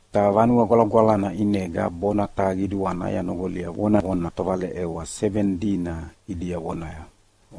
Ta Vanue Gwalagwalana ʼinega bona taha qiduana yanoqolia vonavona tovaleʼewa seveni dina ʼidia vonaya,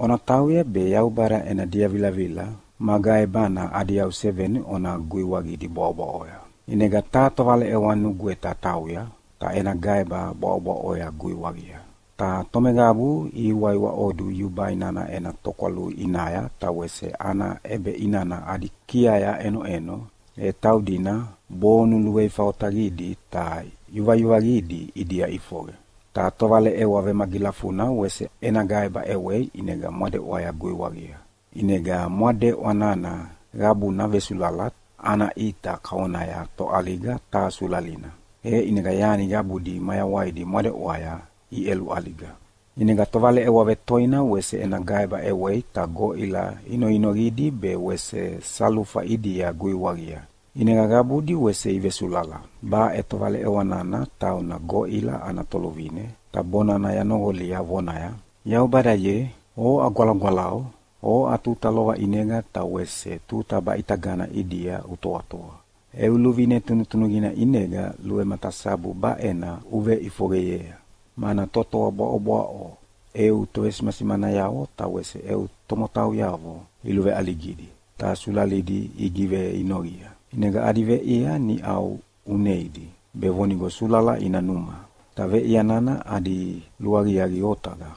“Ona tauya be Yaubada ena diavilavila ma gaebana adi yau seveni ona guiwaqidi bwaʼobwaʼoya.” ʼInega taha tovaleʼewa nugweta tauya, ta ena gaeba bwaʼobwaʼoya guiwaqia. Ta tomeqabu ihiwaiwaʼodu yubai nana ena tokwalui ʼinaya ta wese ana ʼebeʼinana adi kiaya ʼenoʼeno, e taudina bonu luveifa otaqidi ta yuvayuvaqidi ʼidia ʼifoqe. Ta tovaleʼewa vemagilafuna wese ena gaeba ʼewei ʼinega mwadeʼwaya guiwaqia. ʼInega mwadeʼwa nana qabuna vesulala ana ʼita kavonaya toʼaliga taha sulalina, e ʼinega yani qabudi mayawaidi mwadeʼwaya iʼeluʼaliga. ʼInega tovaleʼewa vetoina wese ena gaeba ʼewei ta goʼila inoinoqidi be wese salufa ʼidia guiwaqia, ʼinega qabudi wese ivesulala. Baʼe tovaleʼewa nana tauna goʼila ana toluvine, ta bonana yanoqolia, vonaya, “Yaubada ye, oʼa Gwalagwalau, oʼa tuta lova ʼinega ta wese tuta baʼitagana ʼidia utoatoa. Eu luvine tunutunuqina ʼinega luvematasabu baʼena uveʼifoqeyea, mana totoa bwaʼobwaʼo eu tovesimasimanayavo ta wese eu tomotauyavo iluveʼaligidi ta sulalidi igiveinoqia. ʼInega adi veʼia niʼau uneidi be vonigo sulala ina numa, ta veʼia nana adi luaqiaqi otaqa.”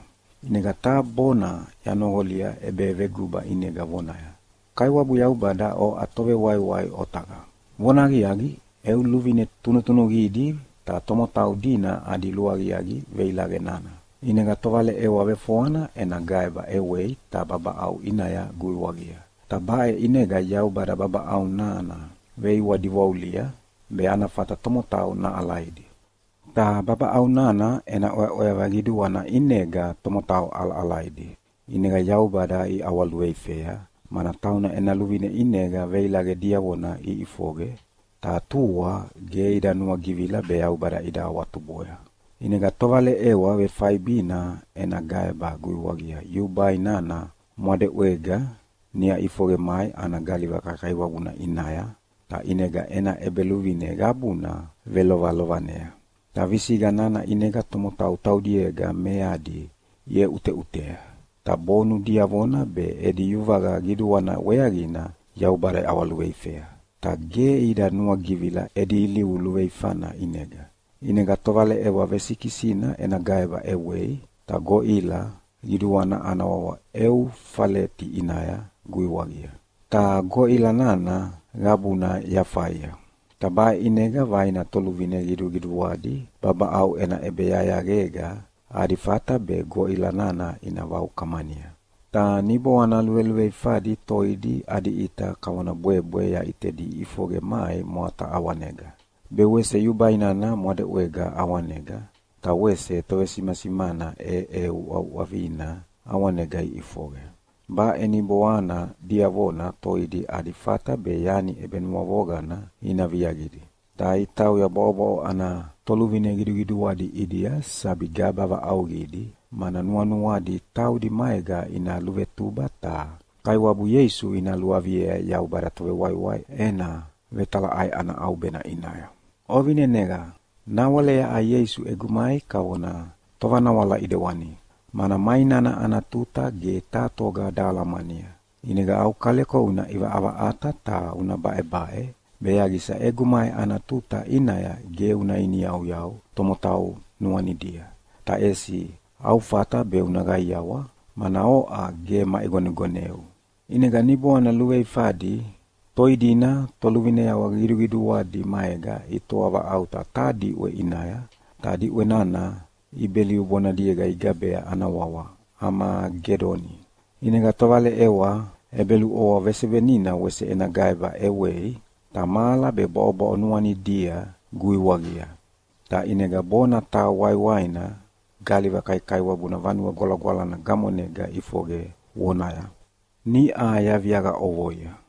ʼInega taha bona yanoqolia ʼebeveguba ʼinega vonaya, “Kaiwabu Yaubada oʼa Tovewaiwai otaqa. Vonahaqiaqi, eu luvine tunutunuqidi ta tomotau dina adi luaqiaqi veilaqe nana.” ʼInega tovaleʼewa vefoana ena gaeba ʼewei ta babaʼau ʼinaya guiwaqia, ta baʼe ʼinega Yaubada babaʼau nana veiwadiwaulia be ana fata tomotau naʼalaidi. Ta babaʼau nana ena ʼweaʼweava qiduana ʼinega tomotau ʼalaʼalaidi, ʼinega Yaubada iʼawaluveifea mana tauna ena luvine ʼinega veilaqe diavona iʼifoqe, ta tua ge ida nuagivila be Yaubada ida awatuboya. ʼInega tovaleʼewa vefaibina ena gaeba guiwaqia yubai nana mwadeʼwega niʼa ʼifoqe mai ana galiva kaikaiwabuna ʼinaya, ta ʼinega ena ʼebeluvine qabuna velovelovanea. Ta visiqa nana ʼinega tomotau taudiega meadi iʼeʼuteʼutea, ta bonu diavona be edi yuvaqa qiduana weaqina Yaubada iʼawaluveifea. Ta ge ida nuagivila edi ilivu luveifana ʼinega. ʼInega tovaleʼewa vesikisina ena gaeba ʼewei ta goʼila qiduana ana wawa Eufaleti ʼinaya guiwaqia, ta goʼila nana qabuna yafaia. Ta baʼe ʼinega vaina toluvine qiduqiduadi babaʼau ena ʼebeyayaqega adi fata be goʼila nana ina vaukamania. Ta niboana luveluveifadi toidi adi ʼita kavona bwebwe yaʼitedi iʼifoqe mai mwata ʼawanega, be wese yubai nana mwadeʼwega ʼawanega, ta wese tovesimasimana ʼeʼeuʼauʼavina ʼawanega iʼifoqe. Baʼe niboana diavona toidi adi fata be yani ʼebenuavoqana ina viaqia. Ta itauya bwaʼobwaʼo ana toluvine qiduqiduadi ʼidia sabi gaba vaʼauqidi, mana nuanuadi taudi maega ina luvetuba ta Kaiwabu Ieisu ina luaviea Yaubada Tovewaiwai ena vetalaʼai ana ʼaubena ʼinaya. Ovineneqa! Nawale yaʼa Ieisu egu mai kavona tovanawala ʼedewani, mana mai nana ana tuta ge taha toga dahalamania. ʼInega au kaleko una ʼivaʼavaʼata ta una baʼebaʼe be yaqisa egu mai ana tuta ʼinaya ge una iniyauyau tomotau nuanidia, ta ʼesi au fata be una qaiawa, mana oʼa ge maʼigonegoneu. ʼInega niboana luveifadi toi dina toluvineavo qiduqiduadi maega itoa vaʼauta taha diʼwe ʼinaya, ta diʼwe nana Ibeliu bonadiega igabea ana wawa Amagedoni. ʼInega tovaleʼewa ʼebeluʼovoa vesevenina wese ena gaeba ʼewei ta mahala be bwaʼobwaʼo nuanidia guiwaqia. Ta ʼinega bona taha waiwaina galiva kaikaiwabuna Vanue Gwalagwalana gamonega ʼifoqe vonaya, “Niʼa yaviaqa ʼovoia.”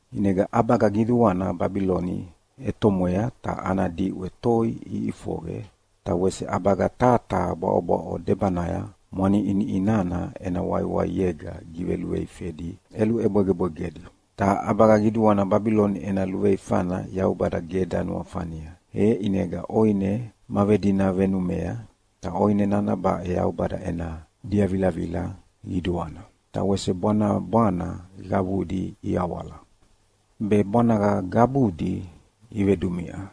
ʼInega ʼabaga qiduana Babiloni ʼetomwea ta ana diʼwe toi iʼifoqe, ta wese ʼabaga taha taha bwaʼobwaʼo debanaya mwaniʼiniʼi nana ena waiwaiega giveluveifedi ʼelubwegebwegedi. Ta ʼabaga qiduana Babiloni ena luveifana Yaubada ge danuafania, e ʼinega ʼoine ma vedina venumea, ta ʼoine nana baʼe Yaubada ena diavilavila qiduana. Ta wese bwanabwana qabudi iawala, be bwanaga qabudi ivedumiʼa.